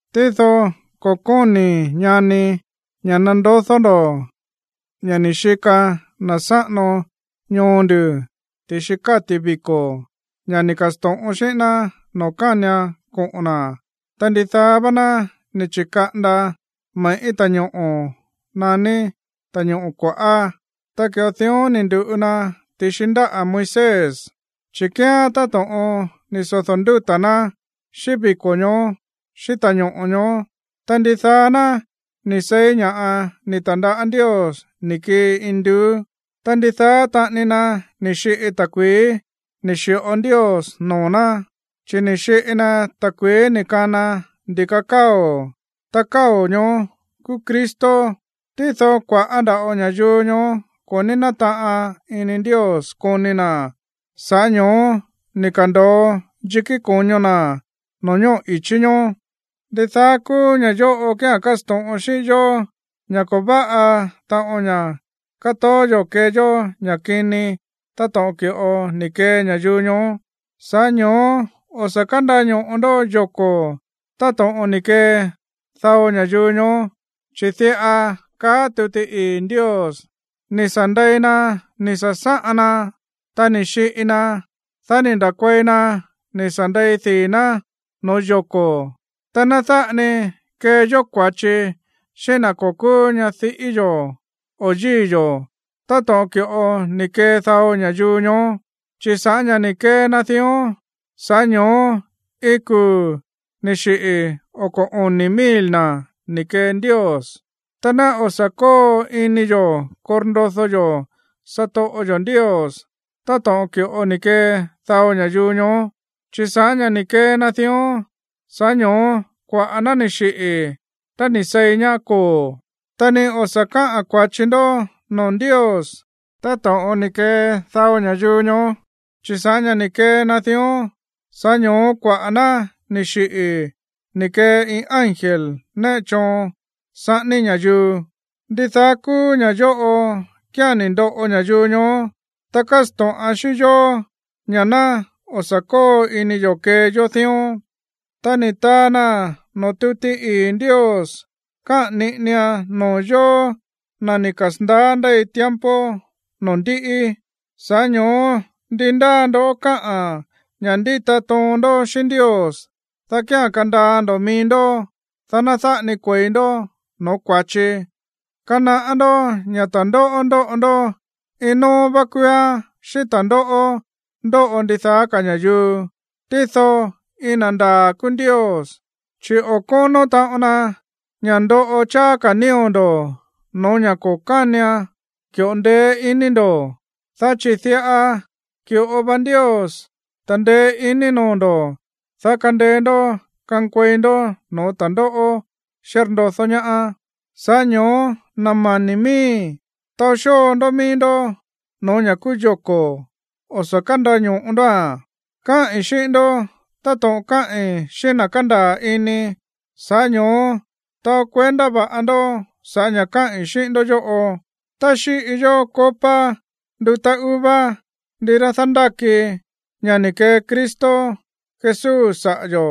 Tído ko̱ kóni̱i̱, ñani, ña̱ nandodó ndo̱ ña̱ ni̱ xika na̱ sáꞌano ñoo nduꞌu̱ ti̱xi káti̱ viko̱, ña̱ ni̱ ka̱sto̱ꞌon xíꞌín ná noo̱ kánian koꞌo̱n na̱. Ta ndidaá vá ná ni̱ chi̱kaꞌanda me̱ꞌí ta̱ñoꞌo̱ naní Ta̱ñoꞌo̱ Kua̱ꞌá. Ta ki̱ꞌo dión ni̱ ndu̱ꞌu na ti̱xi ndáꞌa̱ Moisés, chi̱ kíán táto̱ꞌon ni̱ sodo̱ ndúta̱ ná xíꞌín viko̱ ñoó xíꞌín ta̱ñoꞌo̱ ñoó. Ta ndidaá ná ni̱ seí ña̱ꞌa ni̱ ta̱ndaꞌá Ndios ni̱ kii induú, ta ndidaá taꞌani na ni̱ xiꞌi ta̱kui̱í ni̱ xi̱ꞌo Ndios noo̱ ná. Chi̱ ni̱ xiꞌi na ta̱kui̱í ni̱ kana ndi̱ka káo̱, ta káo̱ ñoó kúú Cristo. Tído kua̱ꞌá nda̱ꞌo ña̱yuu ñoó ko̱ ní nátaꞌan ini Ndios koni na̱. Sa̱ꞌá ño̱ó ni̱ ka̱ndo̱o yikí ko̱ño na̱ no̱ñóꞌo̱ i̱chí ñoó. Ndidaá kúú ña̱ yóꞌo kía̱n kásto̱ꞌon xíꞌín yó ña̱ ko̱ váꞌa taꞌon ña̱ katoó yo̱ kee yó ña̱ kini táto̱ꞌon ki̱ꞌo ni̱ kee ña̱yuu ñoó. Sa̱ꞌá ño̱ó o̱ sa̱ kándaño̱ꞌo ndó yoko̱ táto̱ꞌon ni̱ kee dao ña̱yuu ñoó, chi̱ diꞌa káꞌa̱n tuti ii̱ Ndios: “Ni̱ sa̱ ndei na ni̱ sa̱sáꞌan na, ta ni̱ xiꞌi na, dá ni̱ nda̱kuei na ni̱ sa̱ ndei dii̱ ná no̱ó yoko̱.” Ta ná dáꞌa ni kee yó kua̱chi xíꞌín na̱ ko̱ kúú ñadiꞌí yo̱ o yíi̱ yo̱ táto̱ꞌon ki̱ꞌo ni̱ kee dao ña̱yuu ñoó. Chi̱ sa̱ꞌá ña̱ ni̱ kee na dión, sa̱ꞌá ño̱ó iin kuu̱ ni̱ xiꞌi̱ oko̱ oni̱ mil na̱ ni̱ kee Ndios. Ta ná o̱ sa̱ kóo ini yo̱ korndodó yó satoꞌo yo̱ Ndios táto̱ꞌon ki̱ꞌo ni̱ kee dao ña̱yuu ñoó, chi̱ sa̱ꞌá ña̱ ni̱ kee na dión, sa̱ꞌá ño̱ó kuaꞌa̱ ná ni̱ xiꞌi̱ tá ni̱ seí ñaá koo̱. Ta ni o̱ sa̱ káꞌa̱n kua̱chi ndó noo̱ Ndios táto̱ꞌon ni̱ kee dao ña̱yuu ñoó, chi̱ sa̱ꞌá ña̱ ni̱ kee na dión, sa̱ꞌá ño̱ó kuaꞌa̱ ná ni̱ xiꞌi̱ ni̱ kee iin ángel néꞌe choon saꞌání ña̱yuu. Ndidaá kúú ña̱ yóꞌo kía̱n ni̱ ndoꞌo ña̱yuu ñoó, ta kásto̱ꞌan xíꞌín yó ña̱ ná o̱ sa̱ kóo ini yo̱ kee yó dión, ta ni̱ taa naa̱n noo̱ tuti ii̱ Ndios kaꞌa̱n niꞌinian noo̱ yóó, na̱ ni̱ kasa̱ndaá ndéi tiempo noo̱ ndíꞌi. Sa̱ꞌá ño̱ó ndi ndáa ndó káꞌán ña̱ ndíta toon ndó xíꞌín Ndios, dá kía̱n kandaa ndo̱ mií ndó, dá ná dáꞌa ni kue̱i ndó no̱ó kua̱chi. Kanaꞌá ndó ña̱ ta̱ndóꞌó ndóꞌo ndó, iin nóó vá kúúán xíꞌín ta̱ndóꞌó ndóꞌo ndidaá ka̱ ña̱yuu. Tído iin na̱ ndaa̱ kúú Ndios, chi̱ o̱ kónó taꞌon na ña̱ ndoꞌo cháá ka̱ nío̱ ndo̱ no̱ó ña̱ o̱ ki̱ꞌo ndeé iní ndo̱. Dá chi̱ diꞌa ki̱ꞌo va Ndios ta̱ndeé iní noo̱ ndo̱, dá kandeé ndó kankuei ndó no̱ó ta̱ndóꞌó xírndodó ñaá. Sa̱ꞌá ño̱ó, na̱ mani̱ miíi̱, taó xóo ndó mií ndó no̱ó ña̱ kúú yoko̱, o̱ sa̱ kándaño̱ꞌo ndóa̱n. Káꞌi̱n xíꞌín ndó táto̱ꞌon káꞌi̱n xíꞌín na̱ kándaa̱ ini. Sa̱ꞌá ño̱ó taó kuendá va̱ꞌa ndó sa̱ꞌá ña̱ káꞌi̱n xíꞌín ndó yóꞌo. Tá xíꞌi yó copa ndutá uva, ndirá dándáki ña̱ ni̱ kee Cristo Jesús saꞌa̱ yo̱,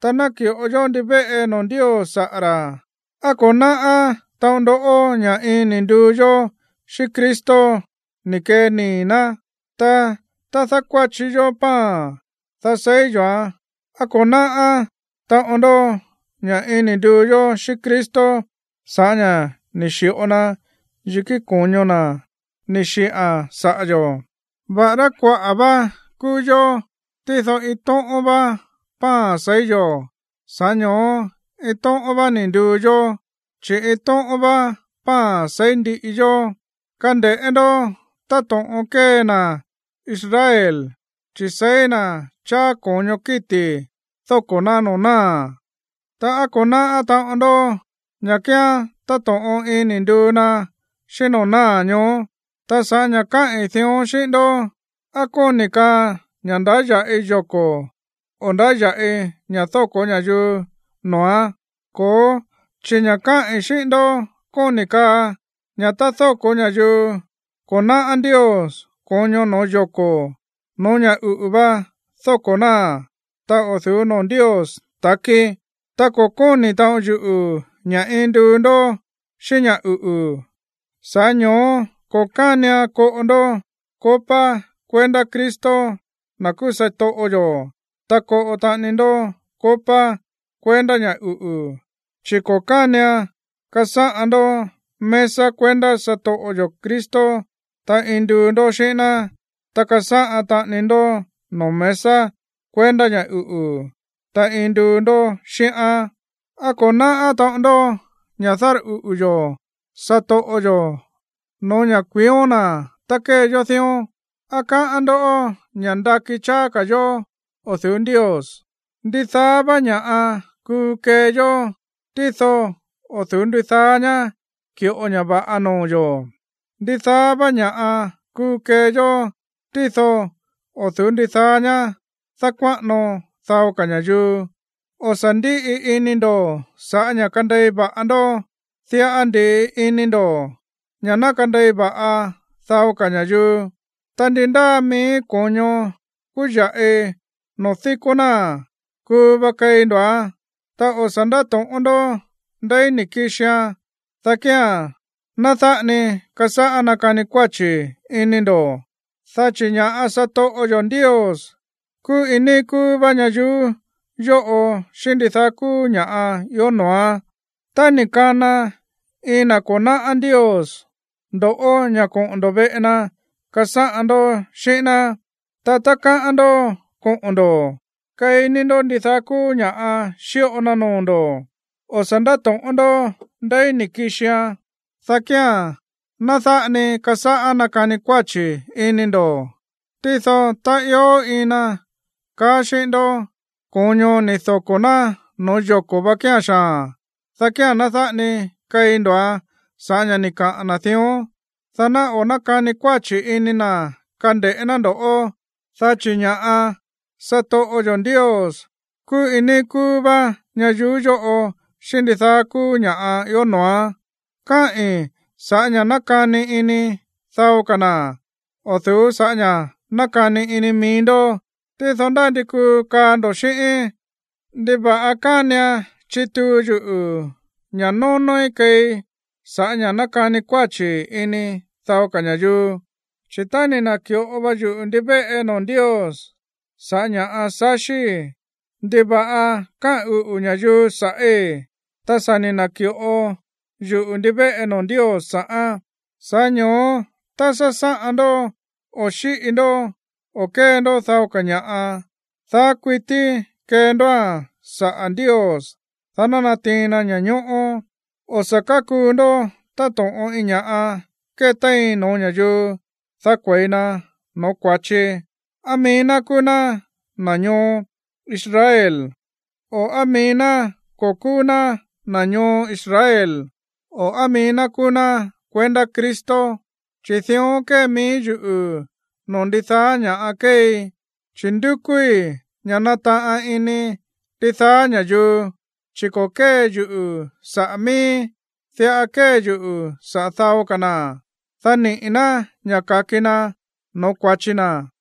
ta náki̱ꞌo yó ndivéꞌe noo̱ Ndios saꞌa̱ ra̱, ¿á ko̱ náꞌá taꞌon ndó ña̱ iin ni̱ nduu yó xíꞌín Cristo ni̱ kee nii̱ ná? Ta tá dákuáchi yó pan, dá seí yo̱án, ¿á ko̱ náꞌá taꞌon ndó ña̱ iin ni̱ nduu yó xíꞌín Cristo sa̱ꞌá ña̱ ni̱ xi̱ꞌo na yikí ko̱ño na̱ ni̱ xiꞌa̱n saꞌa̱ yo̱? Va̱ꞌará kuaꞌa̱ vá kúú yó, tído iin tóꞌón vá pan seí yo̱, sa̱ꞌá ño̱ó iin tóꞌón vá ni̱ nduu yó, chi̱ iin tóꞌón vá pan seí ndiꞌi yó. Kande̱ꞌé ndó táto̱ꞌon kée na̱ Israel. Chi̱ seí na̱ cháá ko̱ño kíti̱ dóko̱ ná noo̱ náa̱, ta, ¿á ko̱ náꞌá taꞌon ndó ña̱ kíán táto̱ꞌon iin ni̱ nduu na xíꞌín noo̱ náa̱ ñoó? Ta sa̱ꞌá ña̱ káꞌi̱n dión xíꞌín ndó, ¿á kóni̱ kaa ña̱ ndáya̱ꞌi yoko̱, o ndáya̱ꞌi ña̱ dóko̱ ña̱yuu noo̱án? Ko̱ó, chi̱ ña̱ káꞌi̱n xíꞌín ndó kóni̱ kaa ña̱ tá dóko̱ ña̱yuu ko̱ náꞌá Ndios ko̱ño no̱ó yoko̱, no̱ó ña̱ uꞌu̱ va dóko̱ náa̱n, ta o̱ du̱ú noo̱ Ndios ta̱kí, ta ko̱ kóni̱ taꞌon yuꞌu̱ ña̱ iin nduu ndó xíꞌín ña̱ uꞌu̱. Sa̱ꞌá ño̱ó ko̱ kánian koꞌo ndó copa kuendá Cristo, na̱ kúú satoꞌo yo̱, ta koꞌo taꞌani ndó copa kuendá ña̱ uꞌu̱, chi̱ ko̱ kánian kasáꞌan ndó mesa kuendá satoꞌo yo̱ Cristo, ta iin nduu ndó xíꞌín ná, ta kasáꞌan taꞌani ndó noo̱ mesa kuendá ña̱ uꞌu̱, ta iin nduu ndó xíꞌán. ¿Á ko̱ náꞌá taꞌon ndó ña̱ dárꞌuꞌu̱ yo̱ satoꞌo yo̱ no̱ó ña̱ kuión na̱ tá kée yó dión? ¿Á káꞌán ndó ña̱ ndakí cháá ka̱ yo̱ o̱ du̱ú Ndios? Ndidaá vá ña̱ꞌa kuu kee yó, tído o̱ du̱ú ndidaá ñá ki̱ꞌo ña̱ va̱ꞌa noo̱ yo̱. Ndidaá vá ña̱ꞌa kuu kee yó, tído o̱ du̱ú ndidaá ñá dákuáꞌano dao ka̱ ña̱yuu. O̱ sa̱ ndíꞌi ini ndo̱ sa̱ꞌá ña̱ kandei va̱ꞌa ndó, diꞌa ndi̱ꞌi ini ndo̱ ña̱ ná kandei va̱ꞌa dao ka̱ ña̱yuu. Ta ndi ndáa mií ko̱ño kúya̱ꞌi noo̱ díkó náa̱n, kuu va keí ndo̱án. Ta o̱ sa̱ ndáto̱ꞌón ndó ndeí ni̱ kixian, dá kía̱n ná dáꞌa ni kasáꞌá nakani kuáchi̱ ini ndo̱. Dá chi̱ ña̱ꞌa satoꞌo yo̱ Ndios kúú iin níí kúú vá ñayuú yóꞌo xíꞌín ndidaá kúú ña̱ꞌa ió noo̱án. Tá ni̱ kana iin na̱ ko̱ náꞌá Ndios ndo̱ꞌó ña̱ koꞌo̱n ndo̱ veꞌe na kasáꞌan ndó xíꞌín ná, ta tá káꞌán ndó koꞌo̱n ndo̱, keí ní ndó ndidaá kúú ña̱ xíꞌo na noo̱ ndo̱. O̱ sa̱ ndáto̱ꞌón ndó ndeí ni̱ kixian, dá kía̱n ná dáꞌa ni kasáꞌá nakani kuáchi̱ ini ndo̱. Tído tá ió iin na kaa xíꞌín ndó: “Ko̱ño ni̱ doko̱ ná no̱ó yoko̱ vá kíán xaa̱n”, dá kía̱n ná dáꞌa ni keí ndo̱án sa̱ꞌá ña̱ ni̱ kaꞌa̱n na̱ dión, dá ná o̱ nákani kuáchi̱ ini na̱ kande̱ꞌé ná ndo̱ꞌó, dá chi̱ ña̱ꞌa satoꞌo yo̱ Ndios kúú iin níí kúú vá ñayuú yóꞌo xíꞌín ndidaá kúú ña̱ꞌa ió noo̱án. Káꞌi̱n sa̱ꞌá ña̱ nákani ini dao ka̱ na̱, o̱ du̱ú sa̱ꞌá ña̱ nákani ini mií ndó. Tído ndá ndi kuu kaa ndo̱ xíꞌíín: “¿Ndiva̱ꞌa kánian chituu yuꞌu̱ ña̱ nónóí keei sa̱ꞌá ña̱ nákani kuáchi̱ ini dao ka̱ ña̱yuu? Chi̱ tá ni̱ na̱ki̱ꞌo va yuꞌu̱ ndivéꞌe noo̱ Ndios sa̱ꞌá ña̱ꞌa saxíi̱, ¿ndiva̱ꞌa káꞌa̱n uꞌu̱ ña̱yuu sa̱ꞌí, ta sa̱ ni̱ na̱ki̱ꞌo yuꞌu̱ ndivéꞌe noo̱ Ndios sa̱ꞌán?” Sa̱ꞌá ño̱ó tá sásáꞌan ndó, o xíꞌi ndó, o kée ndó dao ka̱ ña̱ꞌa, daá kuití kee ndóa̱n saꞌa̱ Ndios, dá ná natiin na ña̱ñóꞌó. O̱ sa̱ kákuu ndó táto̱ꞌon iin ña̱ꞌa kétéin no̱ó ña̱yuu, dá kue̱i na no̱ó kua̱chi, á mií ná kúú ná na̱ ñoo Israel, o á mií ná ko̱ kúú ná na̱ ñoo Israel, o á mií ná kúú ná kuendá Cristo. Chi̱ dión kée mií yuꞌu̱ no̱ó ndidaá ña̱ kéei, chi̱ ndúkúí ña̱ nataꞌan ini ndidaá ña̱yuu, chi̱ ko̱ kée yuꞌu̱ saꞌa̱ miíí, diꞌa kée yuꞌu̱ saꞌa̱ dao ka̱ na̱, dá niꞌi̱ ná ña̱ ka̱ki na no̱ó kua̱chi na̱.